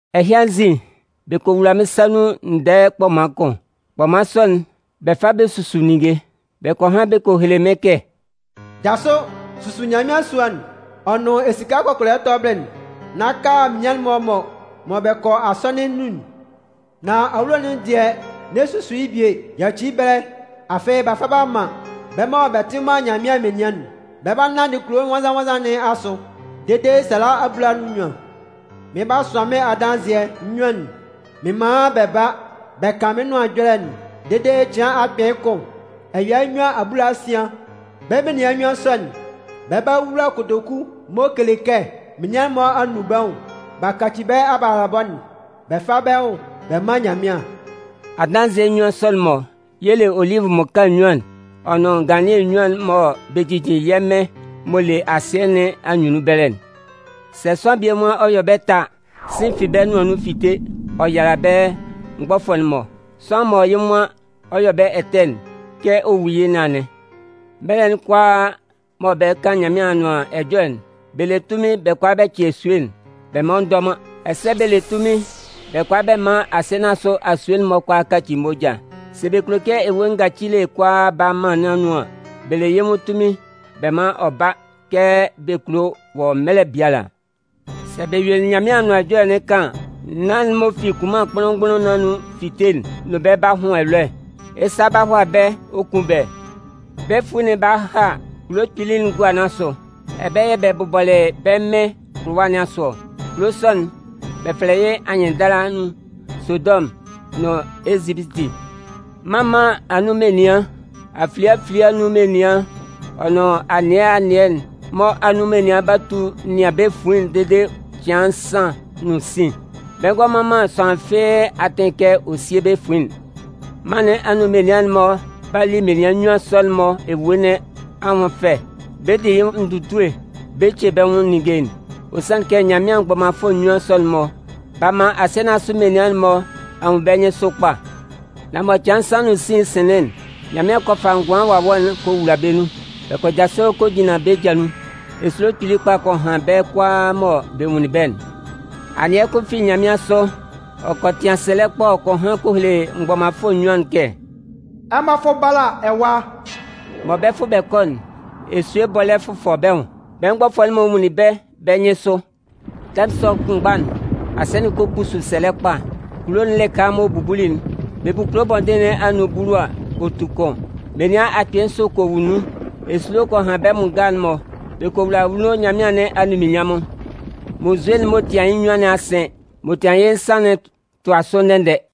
Ɛhɩ anzin, bɛ kɔ wula mɩ́n sa nun ndɛɛ kpɔman kʋn. Kpɔman sɔ'n, bɛ fa bɛ susu ninnge. Bɛ kɔ han bɛ kɔ hele mɩ́n kɛ: “Jasʋ, susu Nyanmɩan sua'n ɔ nʋn esika kɔkɔlɛ tɔbɩlɩ'n, nán ka menian'n-mɔ mɔ bɛ kɔ asɔnɩn nun'n. Nan awulo'n dɩɛ, n'ɛ susu yɩ́ bie, yaci yɩ́ ɛbɛlɛ, afɩ b'a fa b'a man bɛ́ mɔ bɛ tɩ man Nyanmɩan menian'n. Bɛ 'ba nanndɩ kulo nwannzan-nwannzan nɩn asʋ dede sala abulanan nʋn nnyuan. Mɩn 'ba sʋan mɩ́n adanzɩɛ nnyuan'n mɩn man bɛ ba bɛ kan mɩ́n Nʋan Ɛjɔlɛ'n dede cɩan akpɩɩ kʋn ɛya nnyuan abulasian. Bɛ́ menian nnyuan sɔ'n, bɛ 'ba wula kotoku m'ɔ kele kɛ menian'n-mɔ nún bɛ́ nwʋn bɛ káci bɛ́ abalabɔ'n bɛ fá bɛ́ nwʋn bɛ mán Nyanmɩan.” Adanzɩɛ nnyuan sɔ'n-mɔ y'ɔ le olivʋ mmaka nnyuan'n ɔ nʋn nganlannɩɛ nnyuan'n mɔ bɛ jijin yɛ́ Mɩn m'ɔ le asɩɛ nɩn anyunnun ɛbɛlɛ'n. Sɛ sʋanlan bie nwan ɔ 'yɔ bɛ́ ɛtɛ a, sɩ̂n fi bɛ́ nʋan nun fite ɔ yala bɛ́ mgbɔfʋɛ'n-mɔ. Sʋanlan mɔ yɩ́ nwan ɔ 'yɔ bɛ́ ɛtɛ'n, kɛ ɔ 'wu yɩ́ nɩn anɩn. Mɛlɛ'n kʋalaa mɔ bɛ 'kan Nyanmɩan Anʋan Ɛjɔlɛ'n, bɛ le tunmin bɛ kʋala bɛ cɩ esue'n, bɛ man ɔ ndɔ man. Ɛsɛ bɛ le tunmin bɛ kʋala bɛ man asɩɛ nɩn asʋ asue'n-mɔ kʋalaa kaci moja. Sɛ bɛ kulo kɛ ewue ngacile kʋalaa ba mân nɩn anun an, bɛ le yɩ́ nwʋn tunmin bɛ man ɔ ba kɛ bɛ kulo wɔ mɛlɛ biala. Sɛ bɛ yue Nyanmɩan Anʋan Ɛjɔlɛ'n kan an, naan'n m'ɔ fi kunman kpʋnlʋn-mgbʋnlʋn nɩn anun 'fite'n nʋn bɛ́ b'a hʋn ɛlɔɛ. Yɩ́ sa 'ba hʋala bɛ́ ɔ kun bɛ́. Bɛ fuin'n 'ba ha kulo kpili'n gua nɩn asʋ. Ɛbɛlɛ yɛ̂ bɛ bʋbɔlɩ bɛ́ Mɩn kʋlʋwa nɩn asʋ ɔ. Kulo sɔ'n, bɛ fɛlɛ yɩ́ anyɩnndala nun Sodɔmʋn nʋn Ezipiti. Mân mân anun menian, afilie afilie anun menian ɔ nʋn anɩɛ anɩɛ'n-mɔ anun menian 'ba tu nɩan bɛ́ fuin'n dede cɩan nsan nʋn sin. Bɛ ngɔ man man sʋanlan fɩ́ɩ́ atɩn kɛ ɔ síe bɛ́ fuin'n. Mân nɩn anun menian'n-mɔ 'ba li menian nnyuan sɔ'n-mɔ ewue nɩn anwʋn fɛ. Bɛ 'di yɩ́ nwʋn ndutue bɛ ce bɛ́ nwʋn ninnge. Ɔ sanlɩn kɛ Nyanmɩan mgbɔmanfʋɛ nnyuan sɔ'n-mɔ, b'a man asɩɛ menian'n-mɔ a nwun bɛ́ nyɩnsʋ kpa. Nan mɔ cɩan nsan nʋn sin'n sɩnlɩn'n, Nyanmɩan kɔ fa ngʋan wawɛ'n kɔ wula bɛ́ nun. Bɛ kɔ jasʋ kɔ jinlan bɛ́ ja nun. Esulo kpili kpa kɔ han bɛ́ kʋalaa mɔ bɛ nwunlin bɛ́'n. Anɩɛ kʋn fi nyanmɩansʋ, ɔ kɔ tɩan sɛlɛ kpa ɔ kɔ han kɔ hele mgbɔmanfʋɛ nnyuan'n kɛ: “Ɛmɔ fʋ́ bála ɛwa!” Mɔ bɛ 'fʋ bɛ kɔ'n, esue bɔlɛ́ fʋfʋ bɛ́ nwʋn, bɛ́ mgbɔfʋɛ'n-mɔ nwunlin bɛ́ bɛ́ nyɩnsʋ. Tɛmʋn sɔ kʋnmgba'n, asɩɛ'n kɔ kpusu sɛlɛ kpa. Kulo'n lɩka m'ɔ bubuli'n, bɛ bu kulo bɔndɩn nɩn anun bulu a, ɔ tu kʋn. Menian akpɩɩ nsʋ kɔ wu nun. Esulo kɔ han bɛ́ bʋ nga'n-mɔ. Bɛ kɔ wula anwunno Nyanmɩan nɩn anunminnyanmʋn. Munnzue'n m'ɔ tian yɩ́ nnyuan nɩn a sɩn, m'ɔ tian yɩ́ nsan'n tʋa sʋ ndɛ-ndɛ.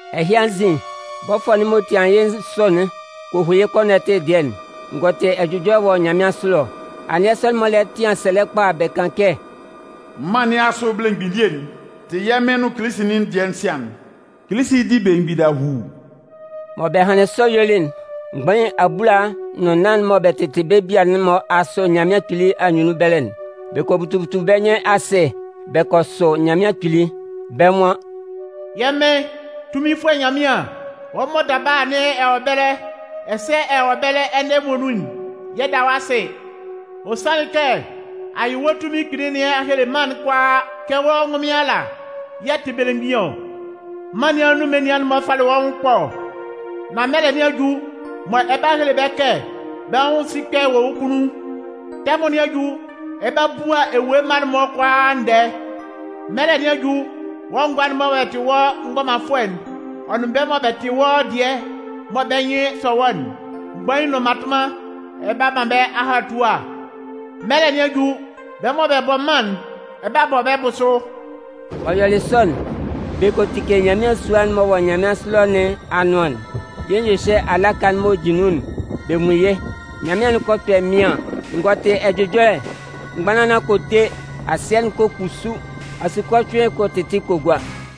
Ɛhɩ anzin, bɔfʋɛ'n m'ɔ tian yɩ́ nsʋ'n kɔ hu yɩ́ kɔnɔtɩ dɩɛ'n. N gɔ tɩ ɛjʋjɔlɛ wɔ nyanmɩansʋ ɛlɔ. Anɩɛ sɔ'n-mɔ lɛ tɩan sɛlɛ kpa bɛ kan kɛ: “Mân nɩn asʋ belemgbin elie'n tɩ yɛ́ Mɩn nʋn yɩ́ Kilisi'n dɩɛ sian'n. Kilisi 'di belemgbin dahuu!” Mɔ bɛ hanlɩn sɔ yuelɩ'n, mgbain abulaa nʋn nnan'n mɔ bɛ tɩtɩ bɛ́ bia'n-mɔ asʋ Nyanmɩan Kpili anyunnun ɛbɛlɛ'n, bɛ kɔ butu butu bɛ́ nyɩn asɩ bɛ kɔ sʋ Nyanmɩan Kpili. Bɛ́ nwan: “Yɛ́ Mɩn, Tunminfʋɛ Nyanmɩan, Wɔ́ mɔ daba anɩn ɛ wɔ ɛbɛlɛ, ɛsɛ ɛ wɔ ɛbɛlɛ ɛnɛ muonun'n, yɛ 'da wɔ́ asɩ. Ɔ sanlɩn kɛ a yɩ wɔ́ tunmin kpili nɩn a hele mân'n kʋalaa kɛ wɔ́ ngʋnmɩn ala yɛ̂ ɛ tɩ belemgbin ɔ. Mân nɩn anun menian'n-mɔ falɩ wɔ́ nwʋn ɛkpɔ. Nan mɛlɛ nɩn a ju mɔ ɛ 'ba hele bɛ́ kɛ bɛ́ nwʋn sikpɛ wɔ wɔ́ kunnun. Tɛmʋn nɩn a ju, ɛ 'ba bua ewue mma'n-mɔ kʋalaa ndɛɛ. Mɛlɛ nɩn a ju, wɔ́ ngʋa'n-mɔ mɔ bɛ tɩ wɔ́ mgbɔmanfʋɛ'n, ɔ nʋn bɛ́ mɔ bɛ tɩ wɔ́ dɩɛ mɔ bɛ́ nyɩn sɔ wɔ́'n, mgbain nʋn mmatʋnman, ɛ 'ba man bɛ́ ahatua. Mɛlɛ nɩn a ju, bɛ́ mɔ bɛ bɔ mân'n, ɛ 'ba bɔ bɛ́ bʋsʋ.” M'ɔ yɔlɩ sɔ'n, bɛ kɔ tike Nyanmɩan sua'n m'ɔ wɔ nyanmɩansʋ ɛlɔ nɩn anʋan'n. Yɩ́ nyɩhyɛ alaka'n m'ɔ jin nun'n, bɛ nwun yɩ́. Nyanmɩan'n kɔ kpɛ mɩaɩn, n gɔ tɩ ɛjʋjɔlɛ, mgbanlanlan kɔ te, asɩɛ'n kɔ kpusu, asukɔcʋɩn kɔ tɩtɩ kɔ gua.